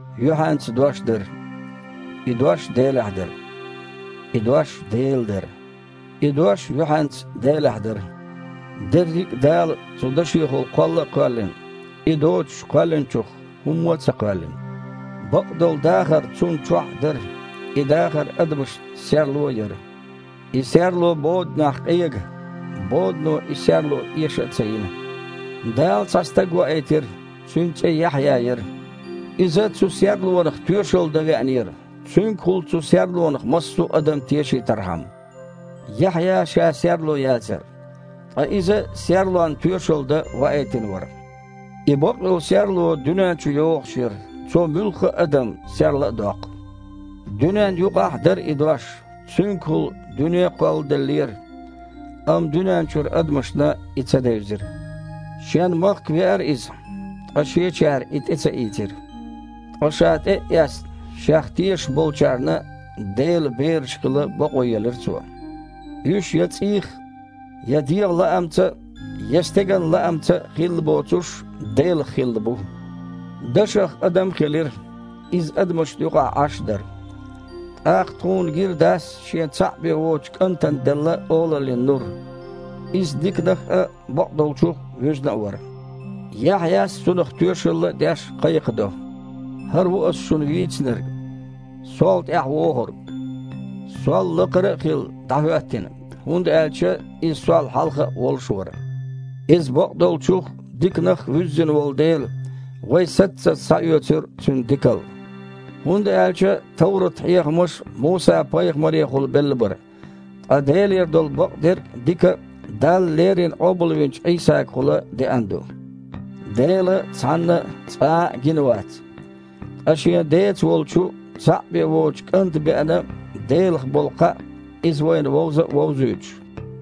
Юьхьанца Дош дара. И Дош Делехь дара. И Дош Дела дара. И Дош юьхьанца Делехь дара. Дерриг а Дала цу Дашехула кхолла а кхоьллина, И доцуш, кхоьллинчух хІумма а ца кхоьллина. Бакъдолу дахар Цунна чохь а дара, и дахар адамашна серло а яра. И серло боданехь къега. Бодано и серло эша а ца йина. Дала цхьа стаг ваийтира, цуьнан цІе Яхьъя яра. Иза цу Серлонах тоьшалла дан веанера, цуьнгахула цу Серлонах массо а адам тешийтархьама. Яхьъя ша Серло яцара, ткъа иза Серлонна тоьшалла дан ваийтина вара. И бакъйолу Серло дуьнен чу йогІуш яра, Цо муьлхха а адам серла а доккху. Дуьненна юкъахь а дара и Дош, Цуьнгахула дуьне а кхолладеллера, амма дуьнен чуьра адамашна И ца девзира. Шен махка веара Иза, ткъа шечара а И тІе ца ийцира. Ткъа, Ша тІе а эцна, Шех тешаш болчарна Делан бераш хила бакъо елира Цо. Уьш я цІийх а, я дегІан лаамца а, я стеган лаамца а хилла боцуш, Делах хилла бу. Дашах адам а хилира, Иза адамашна юкъахь Іаш а дара. ТІаккха тхуна гира Дас Шен цхьаъ бен воцучу КІантана делла олаллин нур. Иза диканах а, бакъдолчух а вуьзна а вара. Яхьъя, Цунах лаьцна тоьшалла а деш, кхайкхадо: «ХІара ву ас шуна вийцинарг: „Сол тІаьхьа ВогІург, сол лакхара а хилла, дІахІоьттина, хІунда аьлча Иза сол хьалха а волуш вара“». Иза бакъдолчух а, диканах а вуьззина волу дела, вай саццаза схьаоьцура Цуьнан дикалла. ХІунда аьлча товрат-хьехамаш Муса-пайхамарехула белла бара, ткъа Делера долу бакъдерг а, дика а Дала леррина къобалвинчу Іийсагахула деана ду. Дела цхьанна а, цкъа а гина вац. Ткъа Шен Деца волчу, цхьаъ бен воцучу КІанта беана Делах болу кхаъ, Иза вайна вовза а вовзуьйтуш.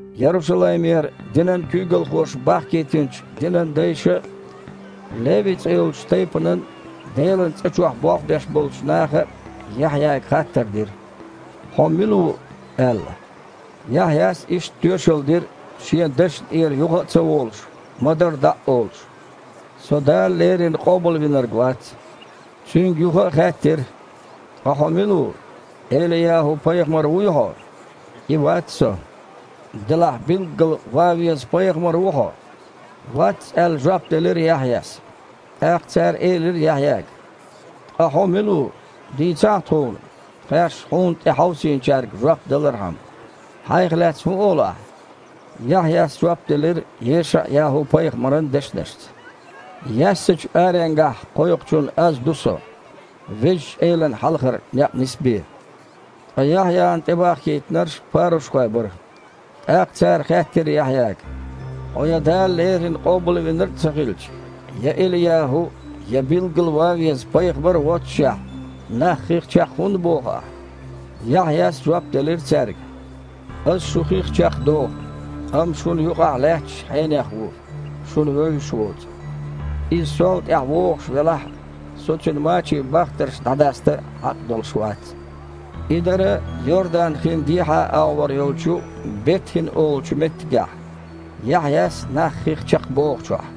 Ярушалаймера динан куьйгалхоша бахкийтинчу динан дайша а, Леви цІе йолчу тайпанан, Делан цІа чохь болх беш болчу наха а Яхьъяга хаттар дира: «Хьо мила ву?» – аьлла. Яхьъяс иштта тоьшалла дира, шен дашна тІера юха а ца волуш, ма-дарра дІа а олуш: «Со Дала леррина Къобалвинарг вац». Цуьнга юха а хаьттира: «Ткъа хьо мила ву? ЭлияхІу-пайхамар вуй хьо?» «И вац со». «Делахь билггала ван веза пайхамар ву хьо?» «Вац», – аьлла, жоп делира Яхьъяс. ТІаккха цара элира Яхьъяга: «Ткъа хьо мила ву, дийцахьа тхуна, тхаьш хьуна тІе хьовсийначаьрга жоп далархьама. Хьайх лаьцна хІун олу ахь?» Яхьъяс жоп делира ЕшаІ-ЯхІу-пайхамаран дешнашца: «Яьссачу аренгахь кхойкхучун аз ду со: „Везачу Элана хьалхара некъ нисбе“». Ткъа Яхьъяна тІебахкийтинарш парушхойх бара. ТІаккха цара хаьттира Яхьъяга: «Хьо я Дала леррина Къобалвинарг а ца хилча, я ЭлияхІу а, я билггала ван веза пайхамар а воццушехь, нах хих чекх хІунда боху ахь?» Яхьъяс жоп делира цаьрга: «Ас шу хих чекхдоху. Амма шуна юкъахь лаьтташ Хьенех ву, шуна вевзаш воцу. Иза сол тІаьхьа вогІуш велахь а, со Цуьнан мачийн бахтарш дІадаста а хьакъ долуш вац». И дара Йордан-хин дехьа агІор йолчу Бет-ХІина олучу меттигехь, Яхьъяс нах хих чекхбохучохь.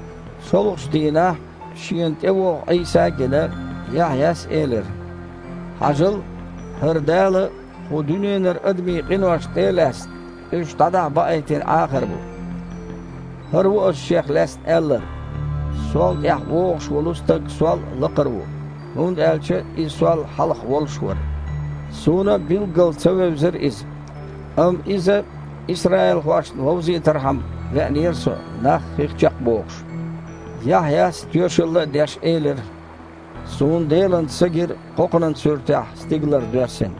ШолгІачу дийнахь, шена тІевогІу Іийса а гина, Яхьъяс элира: «Хьажал, ХІара Дала, кху дуьненара адамийн къинош тІе а лаьцна, уьш дІадахьа баийтина Іахар бу. ХІара ву ас Шех лаьцна аьлларг: „Сол тІаьхьа вогІуш волу Стаг сол а лакхара ву, хІунда аьлча Иза сол хьалха волуш вара“. Суна а билггала ца вевзара Иза. Амма Иза исраилхошна вовзийтархьама, веанера со, нах хих чекхбохуш». Яхьъяс, тоьшалла а деш, элира: «Суна Делан Са гира кхокханан суьртехь стигалара доьссина,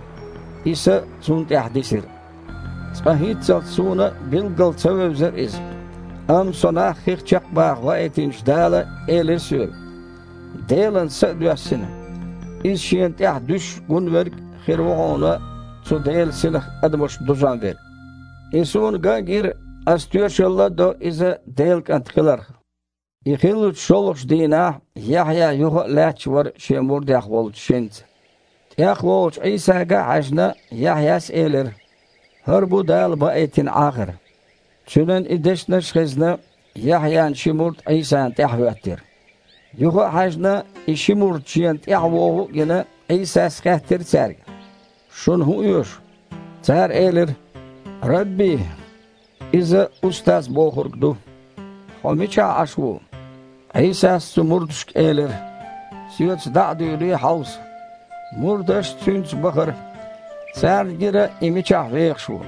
и Са Цунна тІехь дисира. Цкъа хІинццалц суна а билггала ца вевзара Иза, амма со нах хих чекхбаха ваийтинчу Дала элира соьга: „Делан Са а доьссина, Иза Шена тІехь дуьсуш гун верг хир ву хьуна цу Делан Синах адамаш дузон верг“. И суна ган а гира, ас тоьшалла а до Иза Делан КІант хиларх». И хиллачу шолгІачу дийнахь Яхьъя юха а лаьтташ вара шен мурдех волчу шинца. ТІехволучу Іийсага а хьаьжна, Яхьъяс элира: «ХІара бу Дала баийтина Іахар». Цуьнан и дешнаш а хезна, Яхьъян ши мурд Іийсана тІаьхьахІоьттира. Юха а хьаьжна, и ши мурд Шена тІаьхьавогІу а гина, Іийсас хаьттира цаьрга: «Шуна хІун оьшу?» Цара элира: «Рабби!», (Иза «Устаз!» бохург ду), «Хьо мичахь Іаш ву?» Іийсас оцу мурдашка элира: «Соьца дІа а дуьйлий, хьовса». Мурдаш Цуьнца бахара. Царна гира И мичахь вехаш ву.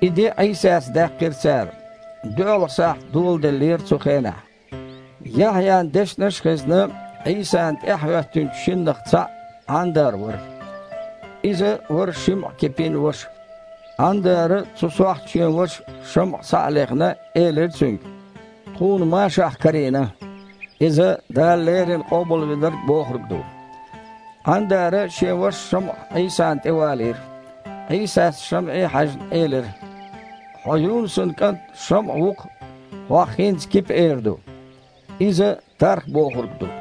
И де Іийсаца даьккхира цара. ДоьалгІа сахьт даьллера цу хенахь. Яхьъян дешнаш а хезна, Іийсана тІаьхьахІоьттинчу шиннах цхьаъ Іандар вара. Иза вара ШамІа-Кипин ваша. Іандара, цу сохьта шен ваша ШамІа схьа а лехна, элира цуьнга: «Тхуна Машахь карийна». (Иза «Дала леррина Къобалвинарг» бохург ду.) Іандара шен ваша ШамІа Іийсана тІевалийра. Іийсас, ШамІе а хьаьжна, элира: «Хьо Юнусан кІант ШамІа ву-кх. Хьох хІинца „Кипа“ эр ду». (Иза « тарх» бохург ду.)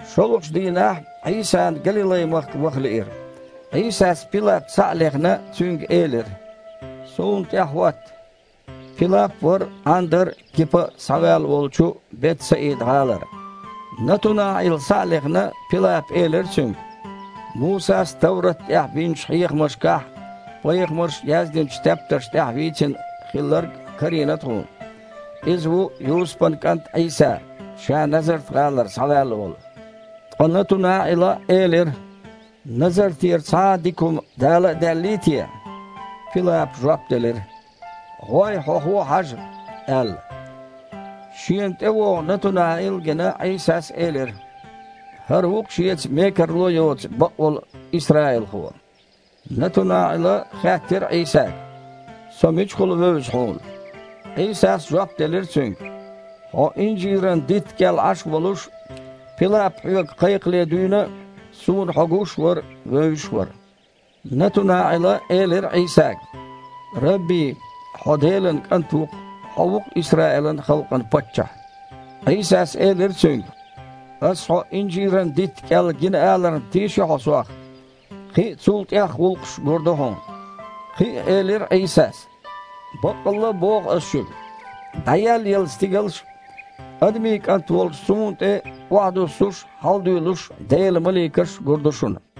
ШолгІачу дийнахь Іийсана Галилай-махка ваха лиира. Іийсас, Пилап схьа а лехна, цуьнга элира: «Суна тІаьхьахІотта». Пилап а вара Іандар а, Кипа а схьаваьлла волчу Бет-Саида-гІалара. НатунаІил схьа а лехна, Пилапа элира цуьнга: «Мусас товрат тІехь бинчу хьехамашкахь а, пайхамарша яздинчу тептарш тІехь а вийцина Хилларг карийна тхуна. Иза ву Юсупан кІант Іийса, Ша Назарт-гІалара схьаваьлла волу». Ткъа НатунаІила элира: «Назартера цхьа а дика хІума дала а даьллий те?» Пилапа жоп делира: «ГІой, хьо-хьуо хьажа», – аьлла. Шена тІевогІу НатунаІил а гина, Іийсас элира: «ХІара ву-кх шеца мекарло а йоцу бакъволу исраилхо». НатунаІила хаьттира Іийсага: «Со мичахула вевза Хьуна?» Іийсас жоп делира цуьнга: «Хьо инжиран дитта кІел Іаш волуш, Пилап хьоьга кхайкхале дуьйна а, Суна хьо гуш а вара, вевзаш а вара». НатунаІила элира Іийсага: « Рабби! Хьо Делан КІант ву-кх. Хьо ву-кх Исраилан халкъан Паччахь». Іийсас элира цуьнга: «Ас хьо инжиран дитта кІел гина аларна тийши хьо Сох? Кхин а, цул тІех гІуллакхаш а гур ду хьуна». Кхин а элира Іийсас: «Баккъалла а боху Ас шуьга: ДІаеллаелла стигалш а, Адамийн КІант волчу Суна тІе охьадуьссуш а, хьаладуьйлуш а Делан маликаш а гур ду шуна».